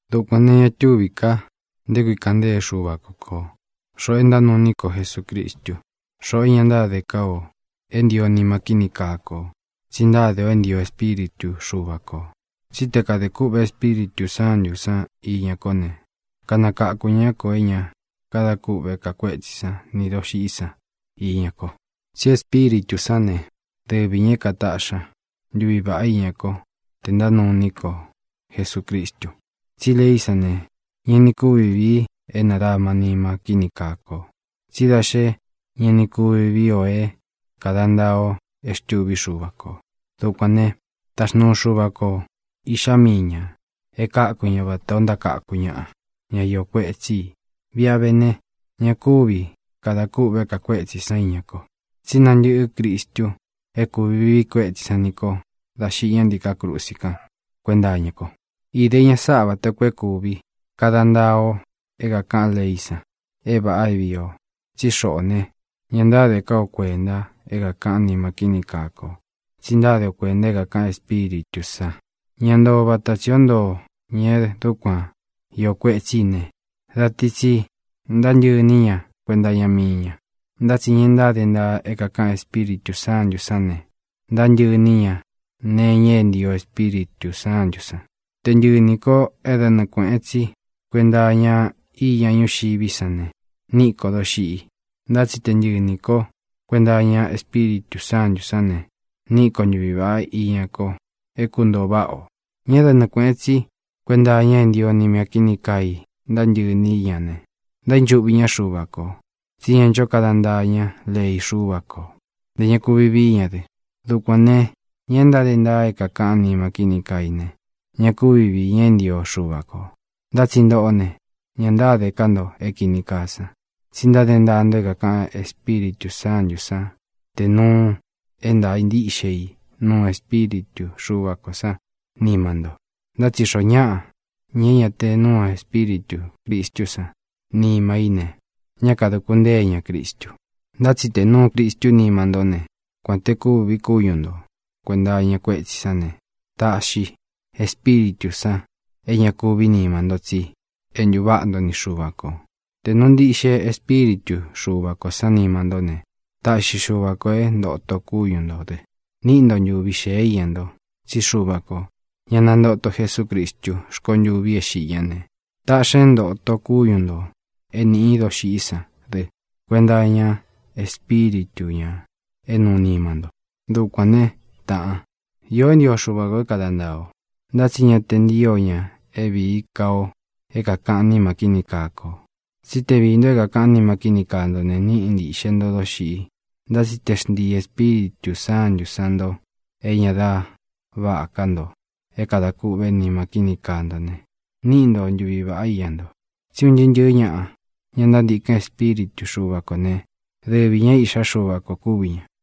Dukuān ne, ña túvī ká nte kui kaꞌan ntee Xuva kó ko, xoꞌō e ntánuu iní ko Jesūcristu, xoꞌō é ña ntáde ká ō é ntio nima kíni kaa ko, tsi ntáde ō é ntio Espíritu Xuva kō. Tsí te kadē kûꞌvé Espíritū Sántū san íña kó ne, kanakakū ñá kō é ña kada kûꞌvé ka kuétsī san ni dóxiꞌí san iña ko. Tsí Espíritū sán ne, dɨvi ñā é kataꞌxi ña ntuvi vāꞌá iña kó tē ntánuu iní ko Jesūcristu. Tsí leí san ne, ña ni kúvi vīi é nādama nima kíni kaa kō, tsí da xé ña ni kuvi víi ō é kāda ntaa o e xtûví Xuva kō. Dukuān né, taxnuu Xuva ko Īꞌxá mii ñā é kaku ña vatā o ntákaku ñaꞌa, ñá iō kuetsí i. Viꞌa vé ne, ña kúvi kadā kûꞌvé ka kuétsī san íña ko, tsí nantɨꞌɨ́ Cristu é kūvi vií kuétsī san ni ko dá xiꞌi ña ntíkā krusi kan kuénta iña ko. Īde ña sáꞌā vata koo é kūvi kada ntaa o é kākaꞌán leí san é vāꞌa é vīi o. Tsí xoꞌō ne, ña ntáde ká o kuēnta é kākaꞌán nima kíni kaa kō, tsi ntáde o kuēnta é kākaꞌan Espíritū san. Ña ntoo vata tsī ó ntoo ña e dúkuan iō kuetsí i ne, da ti tsi ntántɨꞌɨ iní ña kuenta iña mii ña. Ntá tsi ña e ntáde ntaa é kākaꞌan Espíritū Sántū sán ne, ntántɨꞌɨ iní ña nee iña é ntio Espíritū Sántū san. Te ntɨ̄ꞌɨ iní kō é da nɨɨ kuēꞌen tsí kuenta iña iña ñúxiví san ne, níꞌi kō doxiꞌi. Ntá tsi te ntɨ̄ꞌɨ iní ko kuēnta iña Espíritū Sántū sán ne, níꞌi ko ntuvi vāꞌá iña ko é kuntōo váꞌa o. Ña é da nɨɨ kuēꞌen tsí kuenta iña i é ntio nima kíni kaa i ntántɨꞌɨ iní ña ne, ntaínchuꞌvi ñá Xuva kō, tsi ñá ncho kada ntaa ña lei Xúva kō. Ntē ña kuvi vií ña dɨ. Dukuān ne, ña e ntáde ntaa é kākaꞌán nima kíni kaa i ne, ña kúvi viī ña é ntio Xuva kō. Ntá tsi ntōꞌó ne, ña ntáde ká nto é kīni kaa san, tsí ntáde ntaa nto é kākaꞌan Espíritū Sántū san te nuu é ntāa ntíꞌxe i é nūu Espíritu Xuva kō sán nima nto. Ntá tsi xoo ñáꞌa, ña é ña te núu Espíritū Cristú san nima í ne, ñá kadūku ntée ña Cristu. Ntá tsi tē nuu Cristú nima ntó ne, kuān te kuvi kúñu nto kuēnta iña kuétsī sán ne, taꞌxi Espíritū san é ña kuví nima ntó tsi é ntuváꞌa nto ni Xuva kō. Te nūu ntiꞌxe Espíritu Xuva kō sán nima ntó ne, taꞌxi Xuva kō é ntōto kúñu ntō dɨ. Níꞌi nto ntuvi xēé iña nto. Tsí Xuva kō, ña nantoto Jesúcristu rkóntuvi é xiꞌi ñá ne, taꞌxi ña é ntōto kúñu ntō é nīꞌi doxiꞌí san dɨ kuenta iña Espíritu ñā é nūu nima nto. Dukuān né, taꞌan, iō é ntio Xuva kō é kāda ntaa o, ntá tsi ña te ntío ña é vīí ka ō é kākaꞌán nima kíni kaa kō, tsí te viī nto é kākaꞌán nima ntó ne, níꞌi ntīꞌxe nto doxiꞌi. Ntá tsi te xntii Ēspíritū Sántū san nto é ña da váꞌa ká nto é kadā kûꞌvé nima kíni kaa ntō ne, níꞌi nto ntuvi vāꞌá iña nto. Tsí un ntɨɨ́ ntɨ̄ɨ́ ñaꞌa, ña ntántīkɨn Espíritu Xuva kō né, dɨvi ñā é iꞌxá Xuva kō kúvi ñā.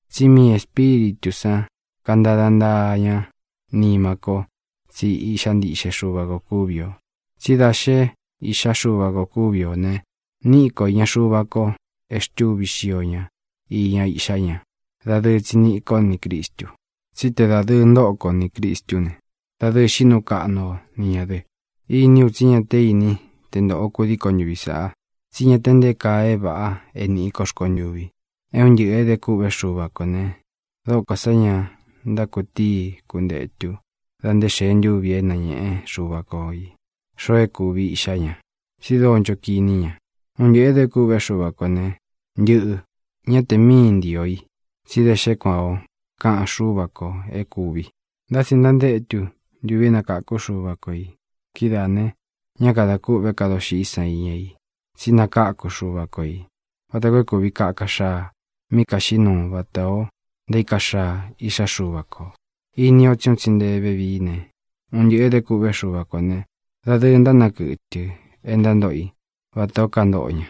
Tsí mii Ēspíritū san kantada ntaa ña nima ko tsí iꞌxá ntiꞌxe Xuva kō kúvi ō. Tsí da xé iꞌxá Xuva kō kúvi ō ne, níꞌi ko īña Xuva ko e xtûví xio ña iña iꞌxá ña. Dadɨɨ tsi niꞌi ko ní Cristu. Tsí tē dadɨɨ ntóꞌo ko nī Cristú ne, dadɨɨ xiꞌí nuu kaꞌnu o ni ñā dɨ. Iní u tsí ña té ini te ntōꞌo kudií ko ntuvi sāꞌá, tsi ñá te nté kaa é vāꞌa é nīꞌi kó rkontuvi. É un ntɨꞌɨ̄ é de kûꞌvé Xuva kō ne, dóko sa ña ntákutíi kuntētu da nté xēe ntúvi é nañēꞌe Xúva ko ī xoo e kúvi iꞌxá ña, tsi dóo ncho kiní ña. Un ntɨꞌɨ̄ é de kûꞌvé Xuva kō né, ntɨꞌɨ. Ña te míi ntio i, tsí da xé kuān o kaꞌan Xúva kō é kūvi. Ntá tsi ntantétu ntuvi é nakāku Xúva ko ī. Kidáā ne, ñá kadā kûꞌvé ka doxiꞌí san iña i, tsí nakākú Xuva ko ī vata koo é kūvi kaka xaa mí kaxiꞌí nuu vata ō ntaíka xaa iꞌxá Xuva kō. Ini o tsí un tsi nté vevií ne, un ntɨꞌɨ̄ é de kûꞌvé Xuva kō ne, dadɨɨ ntánakɨtɨ̄ é ntántoꞌo i vatā ó kantoꞌo ña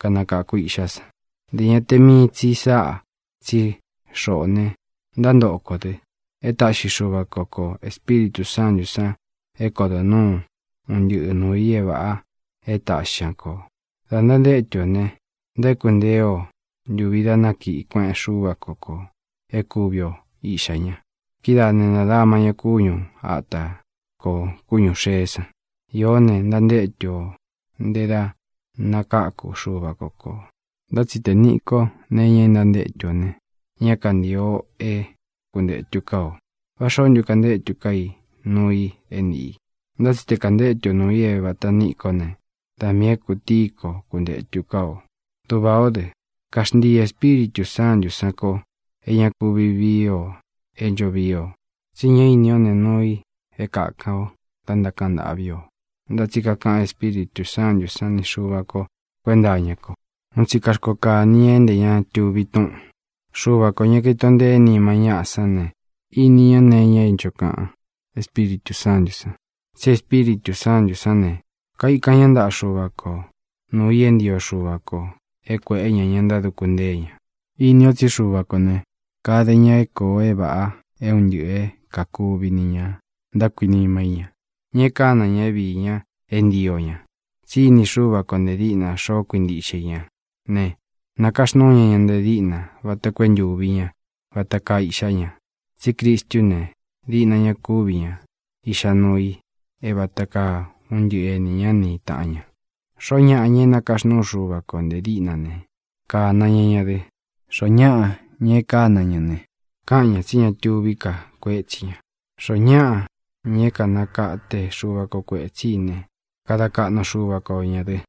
kanakaku iꞌxá san. Ntē ña te mii tsi sáꞌa, tsí xoꞌō ne, ntántoꞌo kō dɨ. E táꞌxi Xuva ko kō Espíritū Sántū san é kodo nuu un ntɨꞌɨ nuū i é vāꞌa é taꞌxi ña kō. Dā ntantétu ō ne, ntaéku nteé o ntūvi dá nākiꞌi kueꞌen Xúva ko kō é kuvi o īꞌxá ña. Kidáā ne, nadama ña kúñu ata kō kúñu xēé san. Iō neé ntantétu ō nte dá nakākú Xuva ko kō. Ntá tsi te nīꞌi ko nee iña é ntantétu ō ne, ñá kantio é kuntetū ká o. ¿Vá xoó ntu kantétu ká i nuu i é nīꞌi i? Ntá tsi te kāntétu o nuū i é vāta níꞌi kó ne, da miī é kutíi ko kuntētu ká ō. Duꞌvā ó dɨ, kaxntii Ēspíritū Sántū san ko é ña kuvi vií ō é ncho vii o. Tsi ñá ini ó neé nuu i é kākan o da ntákaꞌan ntâꞌví ō. Ntá tsi kakaꞌan Espíritū Sántū san ni Xuva ko kuénta iña ko. Un tsi kaxkoo kāni ña é ntē ña tuvi túꞌūn. Xuva kō, ña kaito nteé nima ñáꞌa sán ne, ini ñá nee iña é ncho kaꞌan Espíritū Sántū san. Tsí Espíritū Sántū sán ne, kaikan ñá ntaꞌa Xuva ko nuū i é ntio Xuva kō é kuēꞌé ña ña ntáduku ntée ña. Ini o tsí Xuva kō ne, kade ña é kōo é vāꞌa é un ntɨꞌɨ̄ é kakuvi nī ña ntákuinima i ña, ña e kána ña é viī ña é ntio ña. Tsí ini Xúva kō nte díꞌna xoo kuíntiꞌxe i ña ne, nakaxnúu ña ña nte díꞌna vata koo é ntūvi ña vata kaa Iꞌxá ña. Tsí Cristú ne, diꞌna ña kúvi ña iꞌxá nuu i é vata kaa un ntɨꞌɨ ēní ña ni tāꞌan ña. Xoó ñaꞌa, ña é nakaxnúu Xuva kō nte díꞌna ne, kāna ña ña dɨ. Xoó ñaꞌa, ña e kána ña ne, káꞌan ñā tsí ña tuví ka kuétsi ñā. Xoó ñaꞌa, ña é nakate Xuva ko kuētsí i ne, kada kaꞌnu Xuva ko ñā dɨ.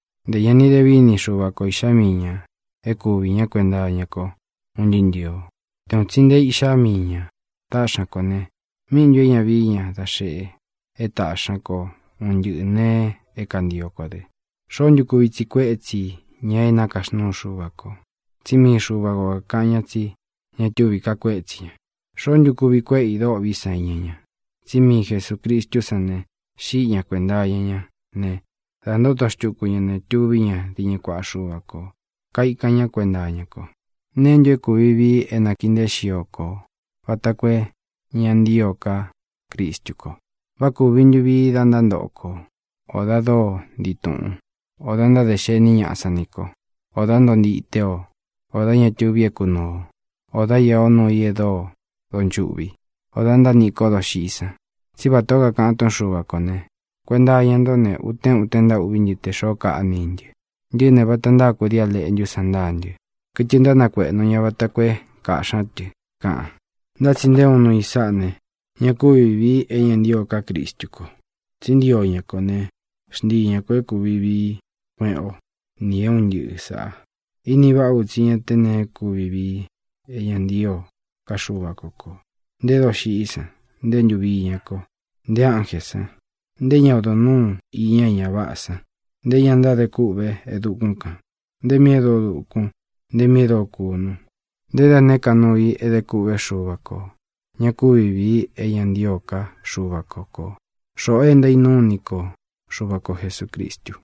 Ntē ña ni de víni Xuva ko Iꞌxá mii ñā é kuvī ñá kuenta iña ko un ntɨɨ́ ntɨ̄ɨ o. Te ūun tsi nte Iꞌxá mii ñā táꞌxi ña kō ne, ¿míꞌi ntū é ña vií ña da xeꞌe é taꞌxi ña ko un ntɨꞌɨ nēe é kantio kō dɨ? ¿Xoó ntu kuvi tsiꞌi kuétsi i ña é nakaxnúu Xuva kō? Tsí mii Xuva ko kākaꞌan ña tsí ña tuví ka kuétsi ñā. ¿Xoó ntu kuvi kuéꞌe i dôꞌví san iña ña? Tsí mii Jesūcristú san ne, xíꞌi ña kuēnta iña ñá ne, dā ntóto xtuku ñā ne, tuví ña diñɨ kuaꞌa Xuva kō, kaikan ñá kuenta iña ko. ¿Neé ntu é kūvi vii é nākiꞌi nteé xio ko vata koo é ña ntío ká Cristu ko? ¿Vá kūvi ntu vii da ntántoꞌo ko, ō da dóo ntii tuꞌun, ō da ntáde xení ñaꞌa san ni ko, ō dá ntoo ntité o, ō dá ña tuvi é kunuu o, ō dá īó nuu i e dóo donchuꞌvi, ō da ntániꞌi kó doxiꞌí san? Tsí vatā ó kakaꞌan túꞌun Xuva kō ne: Kuenta iña ntó ne, utén utén ntaúꞌví ntɨ tē xoó kaꞌní i ntɨ. Ntɨꞌɨ́ ne, vata ntáa kudii a leꞌntú san ntáa ntɨ́, kɨtɨ ntánakuēꞌnu ña vata koo é kāꞌxi ñá tɨ, kaꞌan. Ntá tsi nté uun nuu i sáꞌa ne, ña kúvi vīi é ña ntío ká Cristu ko. Tsi ntío ña kō né, xntii ña kō é kūvi vií kueꞌen o ni é un ntɨꞌɨ sāꞌa. Ini váꞌa u tsí ña te neé kuvi vii é ña ntío ká Xuva ko kō: nté doxiꞌí san, nté ntuvi iña ko, nté ánjē san, nté ña odo nūú iña é ña váꞌā san, nté ña ntádē kûꞌvé e dukún kān, nté míꞌī e dóo dūkun, nté míꞌī e dóo kūnu, nté da nēé ka nuu i é de kûꞌvé Xuva kō ña kuvi vii é ña ntío ká Xuva ko ko, xoꞌō e ntánuu iní ko Xuva ko Jesūcristu.